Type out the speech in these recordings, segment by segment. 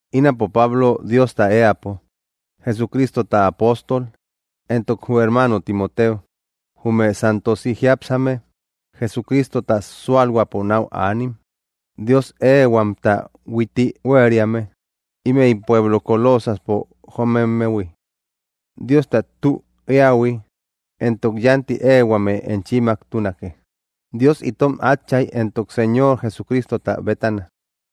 Ínapo, Pablo, Diosta éäpo, Jesucristota apóstol. Entok jü hermaano Timoteo, jume santosi jiápsame, Jesucristota súalhuäpo náu aanim Dios éehuamta huitti huériame ímëi pueblo Colosaspo jomemmehui. Diosta tü eähui entok yánti éehuame enchimmaktunake Dios itom Átchay entok Señor Jesucristota bétana.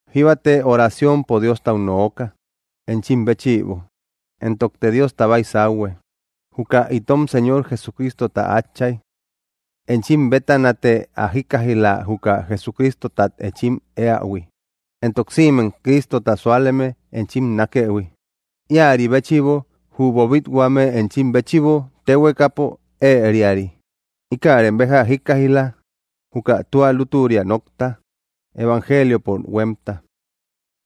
Jíbate oraciompo Diostau nooka enchim béchïbo, entokte Diosta baysauhue, juka itom Señor Jesucristota Átchay. Enchim bétanate ä jíkkaij‑la juka Jesucristotat enchim éähui, entok sïmem Cristota súaleme enchim nákëhui, íäri béchïbo, jü boobit-huame enchim béchïbo téhuekapo ëeriari. Íkärem béja jíkkaij‑la, juka tua lútüria nokta, evangeliopo huémta.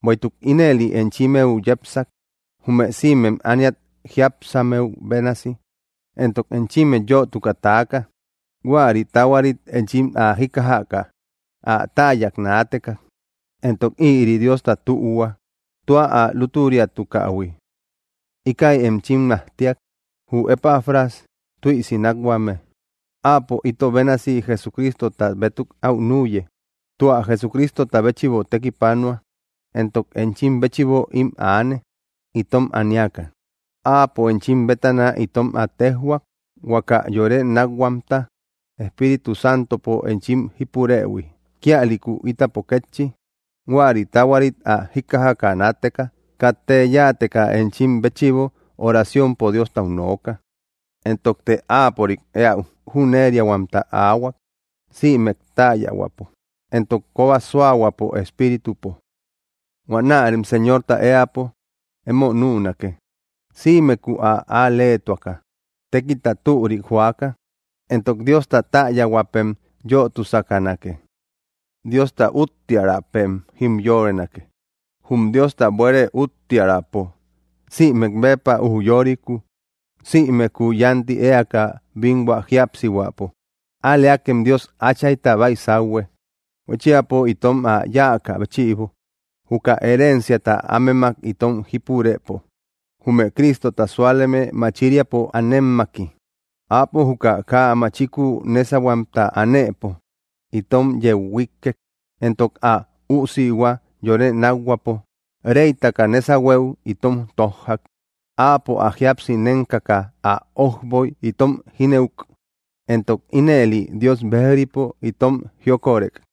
Bueïtuk ínëli enchimmeu yepsak, jume sïmem ániat jiápsammeu bénasi, entok enchimmet yötuka taaka huäri taahuarit enchim ä jíkkajaka ä täyak naateka entok ïri Diosta tühua tua ä lútüriatukähui. Íkäi enchim majtiak, jü Epafras tüisi nákhuame. Áapo ito bénasi Jesucritota bétuk aú nüye, tua Jesucristota béchïbo tekipanua, entok enchim béchïbo ím aane, itom aniaka. Áapo enchim bétana itom ä téjhuak, huaka yore nákhuamta Espíritu Santopo enchim jípurëhui. Kíalïku ítapo kétchi, huäri taahuarit ä jíkkajaka naateka, katte yáateka enchim béchïbo oraciompo Diostau nooka, entokte áapörik éäu jüneriahuamta aahua, sïmek täyahuäpo entok kóba suahuäpo espíritupo. Huanärem Señorta éäpo emo nünake, sïmekuu ä al‑leetuaka, tékilta türik joaka; entok Diosta täyahuäpem yötusakanake. Diosta úttiaräpem jimyorenake, jum Diosta buére úttiaräpo sïmek béppa ujyorikuu, sïmekuu yánti éaka bínhua jíapsihuäpo. Al‑leakem Dios Áchayta baysauhue, huéchiapo itom ä yáakä béchïbo, juka herenciata ámemak itom jípurëpo, jume Cristota súaleme machiriapo anemmaki. Áapo juka kaa machiku nésahuemta anëpo itom yeu huíkkek, entok ä Üusihua yore nákhuäpo reytaka nésahueu itom tójjak. Áapo ä jíapsi nénkaka ä ójboy itom jínëuk, entok ínëli Dios bejripo itom jiokorek.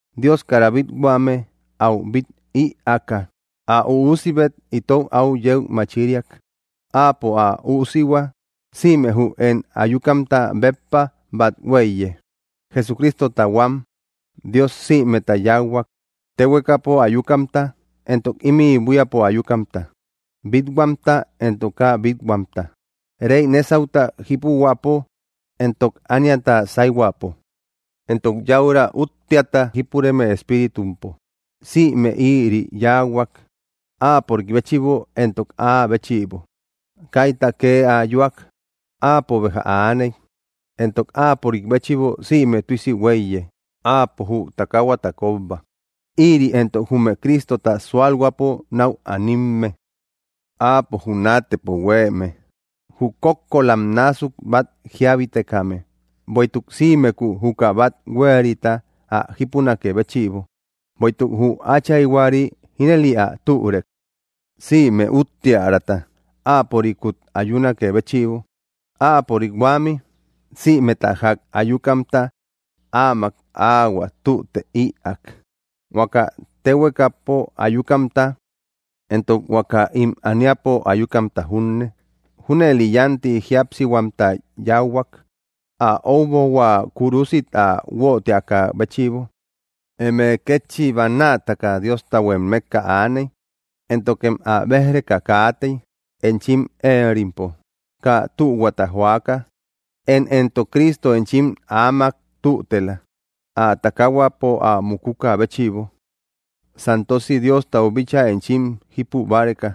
Dios kara bít-huame áu bít ïaaka, ä Üusibet itou áu yeu machiriak. Áapo ä Üusihua sïme jü én ayukamta béppa bat huéiye. Jesucristota huam Dios sïmeta yáuhuak, téhuekapo ayukamta entok ímï buíapo ayukamta, bít-huamta entok kaa bít-huamta, rey nésauta jípuhuäpo, entok ániata sayhuäpo, entok yäura úttiata jípureme espiritumpo. Sïme ïri yáahuak, áapörik béchïbo entok áa béchïbo. Kaita kee ayuak, áapo béja aaney, entok áapörik béchïbo sïme tüisi huéiye. Áapo jü takaahuata kóbba; ïri éntok jume Cristota sualhuäpo nau animme. Áapo jü naatëpo huéeme, jü kókkolam násuk bat jíabitekame, bueïtuk sïmekuu juka bat huéerita ä jípunakë béchïbo. Bueïtuk jü Áchayhuari ínëli ä türek, sïme úttiäraata áapörikut ayunakë béchïbo. Áapörik huämi, sïmeta jak ayukamta áamak áahuä tüte ïaak, huaka téhuekapo ayukamta entok huaka ím ániapo ayukamta junne. Júnëli yánti jíapsihuamta yáuhuak, ä ójbohua kúrusit ä guötiakä béchïbo. Eme kétchi bannaataka Diostahuem mekka aaney éntokem ä béj‑reka kaatey enchim éerimpo, kaa tühuata joaka. Én éntok Cristo enchim áamak tütela, ä takaahuapo ä mukukä béchïbo, santosi Diostau bíchaa enchim jípu báreka,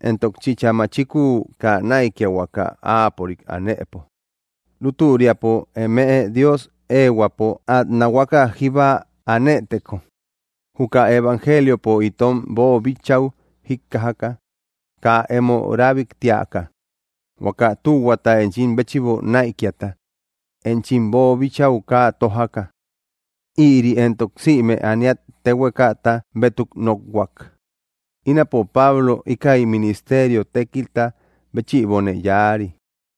entok chïcha machikuu kaa näikiahuaka áapörik anëpo, lútüriapo eme Dios éehuäpo át nahuaka jíba anëteko, juka evangeeliopo itom boobichäu jíkkajaka kaa emo rabiktiaka, huaka tühuata enchim béchïbo näikiata enchim boobichäu kaa tójaka. Ïri éntok sïme ániat téhuekata bétuk nokhuak. Ínapo Pablo íkäi ministerio tékilta béchïbone yáari.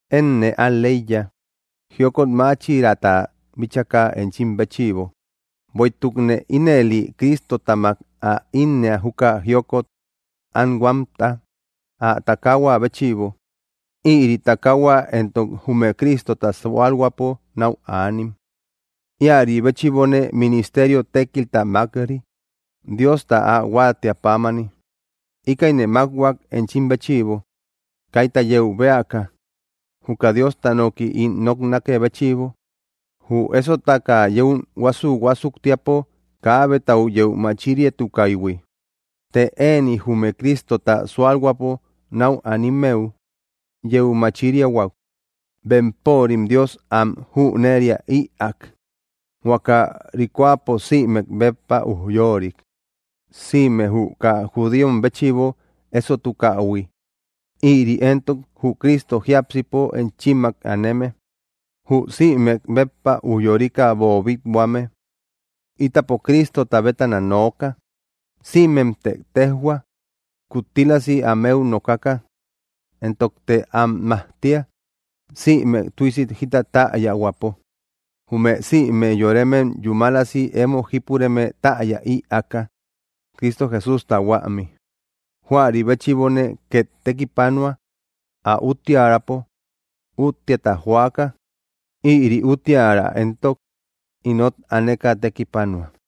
Énne al‑leiya, jiokot máchiraata bíchaka enchim béchïbo, bueïtukne ínëline Cristotamak ä innëa juka jiokot anhuamta, ä takaahua béchïbo. Ïri takaahua éntok jume Cristota sualhuäpo nau anim. Íäri béchïbone ministerio tékilta mák‑ri, Diosta ä huátiä pámani. Íkäine mákhuak enchim béchïbo, kaita yeu bëaka, juka Diosta noki ín noknakë béchïbo, jü ésotaka yún huásu‑huásuktiapo kaabetau yeu machiriatukaïhui. Të ëni jume Cristota súalhuäpo náu animmeu yeu machiriahuak. Bempörim Dios am jüneria ïak, huaka ríkoapo sïmek béppa ujyoorik, sime jü kaa judíom béchïbo ésotukahui. Ïri éntok jü Cristo jiápsipo enchimmak aneme, jü sïmek béppa ujyorika boobit-huame. Ítapo Cristota bétana nooka. Sïmemte téjhua, kuttílasi ámeu nokaka, entokte am majtia, sïmek tüisi jita täyahuäpo, jume sïme yoremem yúmalasi emo jípureme täya ïaaka, Cristo Jesústa huämi. Juäri béchïbone két tekipanua, ä úttiärapo úttiata joaka. Ïri úttiära éntok inot aneka tekipanua.